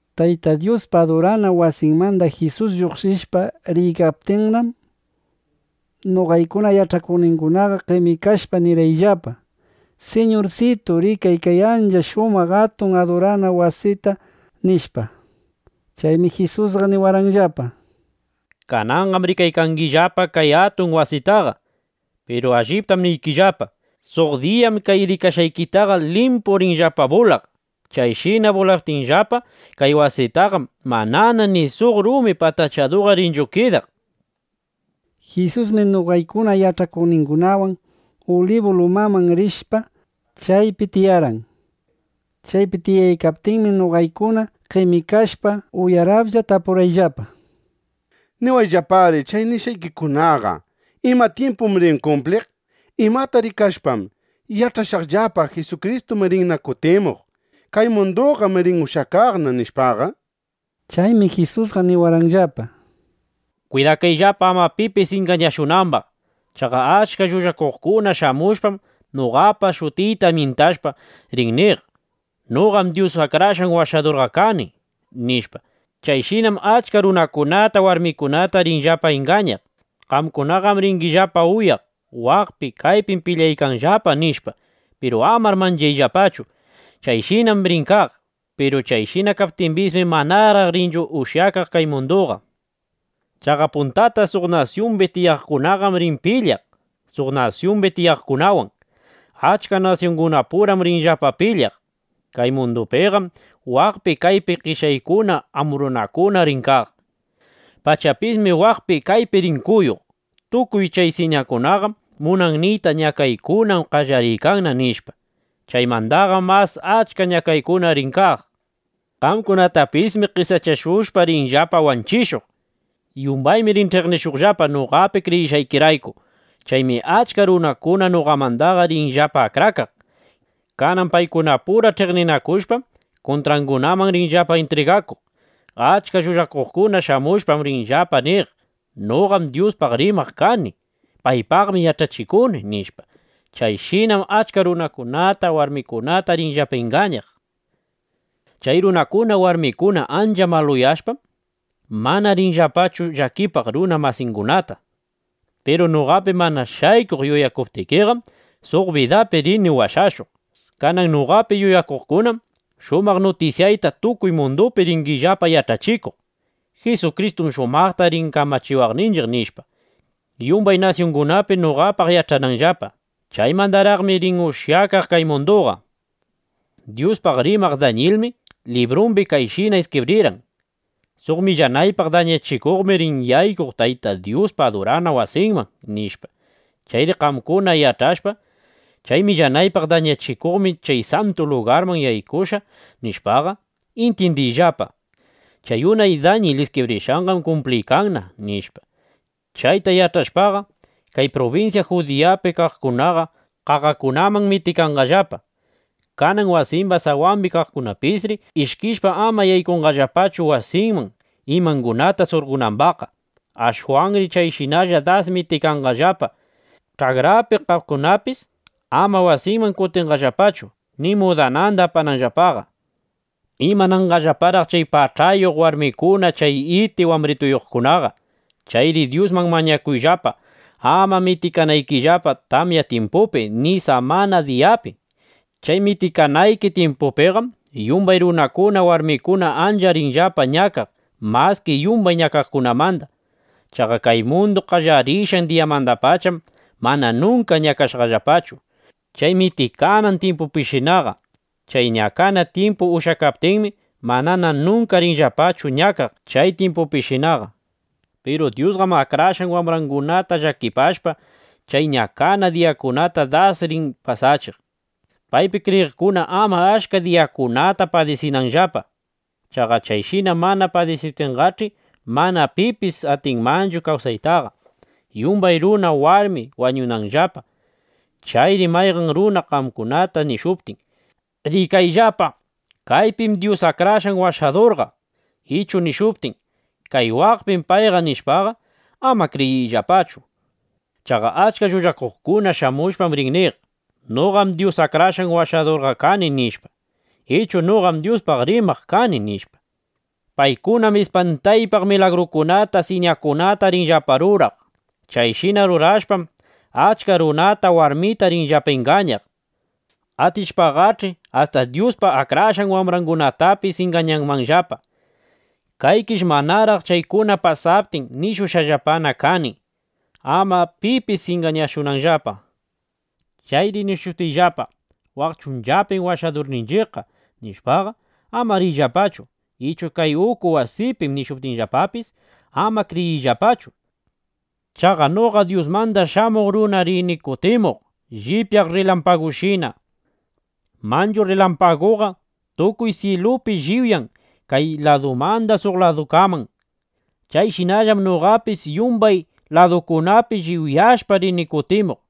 Tayta Dyuspa adurana wasinmanda Jisus lluqshishpa riykaptinnam, noqaykuna yach'akuqningunaqa qemikashpa, nirqayllapa: —¡Siñursitu, rikay kay ancha shumaq atun adurana wasita! nishpa. Chaymi Jisusqa niwarqanllapa: —Kananqam rikaykangillapa kay atun wasitaqa. Piru alliptam niykillapa, suq diyam kay rikashqaykitaqa limpu rinllapa bulaq. Chayshina bulaptinllapa kay wasitaqam, manana ni suq rumi patachaduqa rinchu kidaq, nishpa. Jisusmi noqaykuna yach'akuqningunawan Ulibu lumaman rishpa, chaypi tiyarqan. Chaypi tiyaykaptinmi noqaykunaqa qemikashpa, uyaraplla (uyaralla) tapurqayllapa: —Niwayllapari chay nishqaykikunaqa ¿ima tyimpum rin kumpliq? ¿Imata rikashpam yach'ashaqllapa: Jisukristum rinna kutimuq. Kay munduqam rin ushyakaqna, nishpaqa? Chaymi Jisusqa niwarqanllapa: —Kwidakayllapa ama pipis ingañashunambaq. Chaqa achka llullakuqkuna shamushpam, noqapa shutiyta myintashpa, rin niq: “Noqam Dyus Akrashqan Washadurqa kani”, nishpa. Chayshinam achka runata, warmita rinllapa ingañaq. Qamkunaqam ringillapa uyaq: “Waqpi, kaypim pilyaykanllapa”, nishpa. Piru amar manchayllapachu. Chayshinam rin kaq. Piru chayshina kaptimbismi, manaraq rinchu ushyakaq kay munduqa. Chaqa puntata suq nasyumbi tiyaqkunam rin pilyaq suq nasyumbi tiyaqkunawan. Achka nasyungunapuram rinllapa pilyaq. Kay mundupiqam waqpi, kaypi qeshyaykuna, ambrunakuna rin kaq. Pachapismi waqpi kaypi rin kuyuq. Tukuy kay siñakunaqam munan niyta, ñakaykunam qallariykanna, nishpa. Chaymandaqam mas achka ñakaykuna rin kaq. ’Qamkunatapismi qesachashushpa, rinllapa wanchishuq. Yumbaymi rin ch'iqnishuqllapa, noqapi kriyishqaykirayku. Chaymi achka runakuna noqamandaqa rinllapa akrakaq. Kanan paykunapura ch'iqninakushpam, kuntrangunaman rinllapa intriganakuq. Achka llullakuqkuna shamushpam, rinllapa niq: “Noqam Dyuspaq rimaq kani. (Paypaqmi yach'achikuni)” nishpa. Chayshinam achka runata warmita rinllapa ingañaq. Chay runakuna, warmikuna ancha maluyashpam, manana rinllapachu llakipaq runa masingunataqa. Piru noqapi mana shaykuq yuyakuptikiqam, suq bidapi rini washashuq. Kanan noqapi yuyakuqkunam shumaq nutisyayta tukuy mundupi ringillapa yach'achikuq: Jisukristum shumaqta rin kamachiwaqninchiq, nishpa, yumbay nasyungunapi noqapaq yach'ananllapa. Chaymandaraqmi rin ushyakaq kay munduqa. ’Dyuspaq rimaq Dañilmi (unay tyimpupi) librumbi kayshina iskibrirqan: “Suq millanaypaq dañachikuqmi rin yaykuq Tayta Dyuspa adurana wasinman”, nishpa. Chayri qamkuna yach'ashpa: Chay millanaypaq dañachikuqmi chay santu lugarman yaykushqa, nishpaqa, intyindiyllapa: Chay unay Dañil iskibrishqanqam kumpliykanna, nishpa. Chayta yach'ashpaqa, kay prubinsya Judiyapi kaqkunaqa qaqakunaman mitikanqallapa. Kanan wasimba sawambi kaqkunapisri ishkishpa, ama yaykunqallapachu wasinman, imangunata surqonambaqqa. Ashwanri chayshinalla das mitikanqallapa. Ch'akrapi kaqkunapis ama wasinman kutinqallapachu, ni mudananda apananllapaqa. ¡Imananqallaparaq chay pach'ayuq (ukuyuq) warmikuna, chay iti wambrituyuqkunaqa! Chayri Dyusman mañakuyllapa, ama mitikanaykillapa tamya tyimpupi, ni samana diyapi. Chay mitikanayki tyimpupiqam yumbay runakuna, warmikuna ancha rinllapa ñakaq maski yumbay ñakaykunamanda. Chaqa kay mundu qallarishqan diyamandapacham mana nunka ñakashqallapachu chay mitikanan tyimpupishinaqa. Chay ñakana tyimpu ushyakaptinmi, manana nunka rinllapachu ñakaq chay tyimpupishinaqa. Piru Dyusqam akrashqan wambrangunata llakipashpa, chay ñakana diyakunata das rin pasachiq, paypi kriyiqkuna ama achka diyakunata padisinanllapa. Chaqa chayshina mana pasachiptinqach'i, mana pipis atinmanchu kawsaytaqa. Yumbay runa, warmi wañunmanllapa. ’Chayri mayqan runa qamkunata nishuptin: “¡Rikayllapa, kaypim Dyus Akrashqan Washadurqa!” ichu nishuptin: “Kay waqpim payqa”, nishpaqa, ama kriyiyllapachu. Chaqa achka llullakuqkuna shamushpam rin niq: “Noqam Dyus Akrashqan Washadur kani”, nishpa, ichu “Noqam Dyuspaq rimaq kani”, nishpa. Paykunam ispantaypaq milagrukunata, siñakunata rinllapa ruraq. Chayshina rurashpam, achka runata, warmita rinllapa ingañaq. Atishpaqach'i, asta Dyuspa akrashqan wambrangunatapis ingañanmanllapa. Kaykish manaraq chaykuna pasaptin, nishushqallapana kani (ama pipis ingañashunanllapa). Chayri nishuptinllapa: “Waq chunchapim Washadurninchiqqa”, nishpaqa, ama riyllapachu; ichu “Kay uku wasipim”, nishuptinllapapis, ama kriyiyllapachu. Chaqa noqa Dyusmanda Shamuq Runam rini kutimuq llipyaq rrilampagushina. Manchu rrilampaguqa tukuy syilupi lliwyan kay ladumanda suq ladukaman. Chayshinallam noqapis yumbay ladukunapi lliwyashpa, rini kutimuq.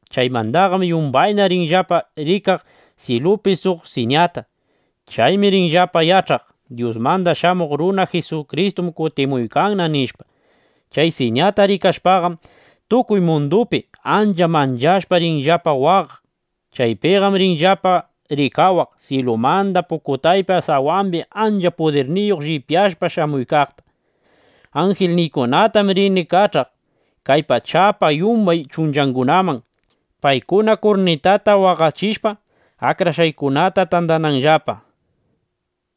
Chaymandaqam yumbayna rinllapa rikaq syilupi suq siñata. Chaymi rinllapa yach'aq: Dyusmanda Shamuq Runa Jisukristum kutimuykanna, nishpa. Chay siñata rikashpaqam, tukuy mundupi ancha manchashpa, rinllapa waqaq. Chaypinam rinllapa rikawaq, syilumanda pukutaypa sawambi, ancha pudirniyuq llipyashpa shamuykaqta. Anjilniykunatam rini kach'aq kay pachapa yumbay kuchungunaman, paykuna kurnitata waqachishpa, akrashqaykunata tandananllapa.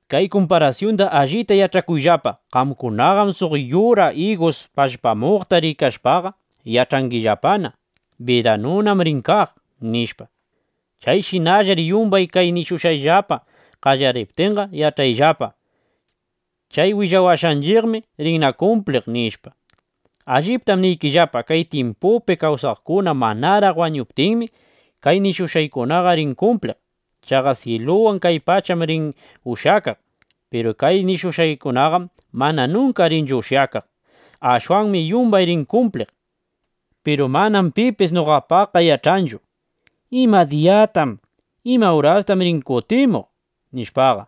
’Kay kumparasyunda allita yach'akuyllapa: Qamkunaqam suq yura igusta pallpamuykaqta rikashpaqa, yach'angillapana: Biranunam rin kaq, nishpa. Chayshinallar yumbay kay nishushqayllapa qallariptinqa, yach'ayllapa: Chay willawashqanchiqmi rinna kumpliq, nishpa. Alliptam niykillapa, kay tyimpupi kawsaqkuna manaraq wañuptinmi, kay nishushqaykunaqa rin kumpliq. Chaqa syiluwan kay pacham rin ushyakaq. Piru kay nishushqaykunaqam mana nunka rinchu ushyakaq. Ashwanmi yumbay rin kumpliq. ’Piru manam pipis noqapaqqa yach'anchu: ¿Ima diyata, ima urastam rin kutimuq? nishpaqa.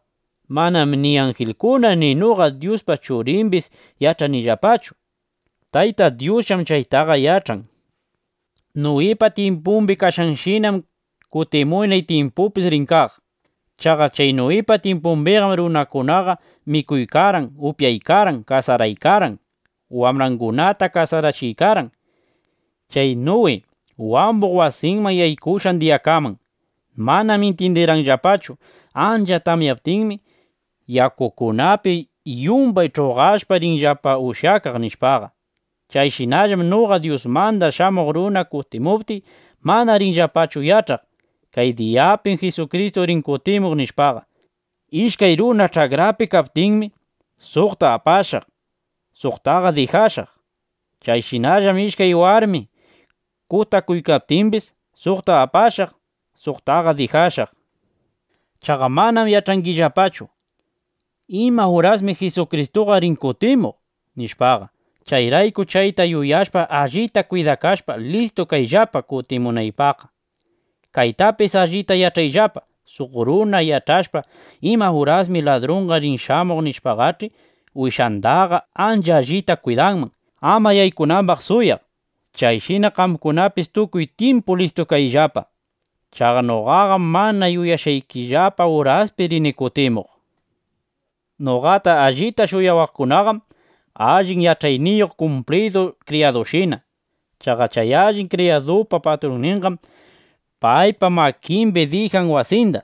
Manam ni anjilkuna ni noqa Dyuspa Churimbis yach'anillapachu. Tayta Dyusllam chaytaqa yach'an. Nuwipa tyimpumbi kashqanshinam, kutimunay tyimpupis rin kaq. Chaqa chay Nuwipa tyimpumbiqam runakunaqa mikuykarqan, upyaykarqan, kasaraykarqan, wambrangunata kasarachiykarqan, chay Nuwi wambuq wasiman yaykushqan diyakaman. Manam intyindirqanllapachu: Ancha tamyaptinmi, yakukunapi yumbay ch'uqashpa rinchiqllapa ushyakaq, nishpaqa. Chayshinallam noqa Dyusmanda Shamuq Runa kutimuptiy, mana rinllapachu yach'aq: Kay diyapim Jisukristu rin kutimuq, nishpaqa. Ishkay runa ch'akrapi kaykaptinmi, suqta apashaq, suqta dijashaq. Chayshinallam ishkay warmi kutakuykaptimbis, suqta apashaq, suqta dijashaq. ’Chaqa manam yach'angillapachu: ¿Imurasmi Jisukristuqa rin kutimuq? nishpaqa. Chayrayku chayta yuyashpa, allita kwidakashpa, listu kayllapa kutimunaypaqqa. Kaytapis allita yach'ayllapa, suq runa yach'ashpa, ima urasmi ladrunqa rin shamuq, nishpaqach'i, wasindaqa ancha allita kwidanman, ama yaykunambaq suwaq. Chayshina qamkunapis tukuy tyimpu listu kayllapa. Chaqa noqaqam mana yuyashqaykillapa uraspi rini kutimuq. ’Noqata allita shuyawaqkunaqam allin yach'ayniyuq kumplidu kriyadushina. Chaqa chay allin kriyadupa patrunninqam paypa makimbi dijan wasinda: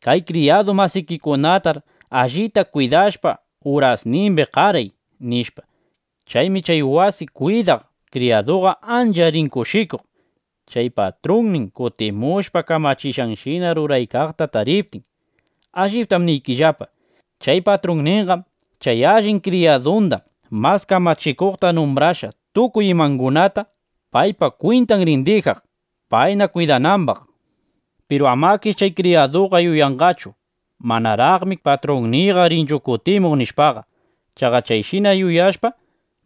“Kay kriyadu masikikunatar allita kwidashpa, urasnimbi qaray”, nishpa. Chaymi chay wasi kwidaq kriyaduqa ancha rin kushikuq, chay patrunnin kutimushpa, kamachishqanshina ruraykaqta tariptin. Alliptam niykillapa, chay patrunninqam chay allin kriyadunda mas kamachikuqta numbrashpa, tukuy imangunata paypa kwintan rin dijaq, payna kwidanambaq. Piru amakish chay kriyaduqa yuyanqachu: Manaraqmi patrunniyqa rinchu kutimuq, nishpaqa. Chaqa chayshina yuyashpa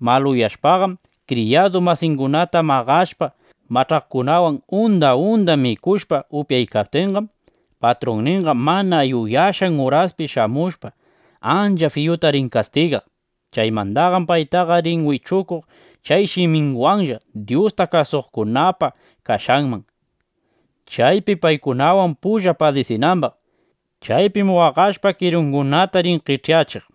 maluyashpaqam, kriyadu masingunata maqashpa, mach'aqkunawan unda unda mikushpa, upyaptinqam, patrunninqa mana yuyashqan uraspi shamushpa, ancha fiyuta rin kastigaq. Chaymandaqam paytaqa rin wichukuq chay shiminwanlla Dyusta kasuqkunapa kashqanman, chaypi paykunawan pulla padisinambaq. Chaypim waqashpa, kirungunata rin qech'yachiq.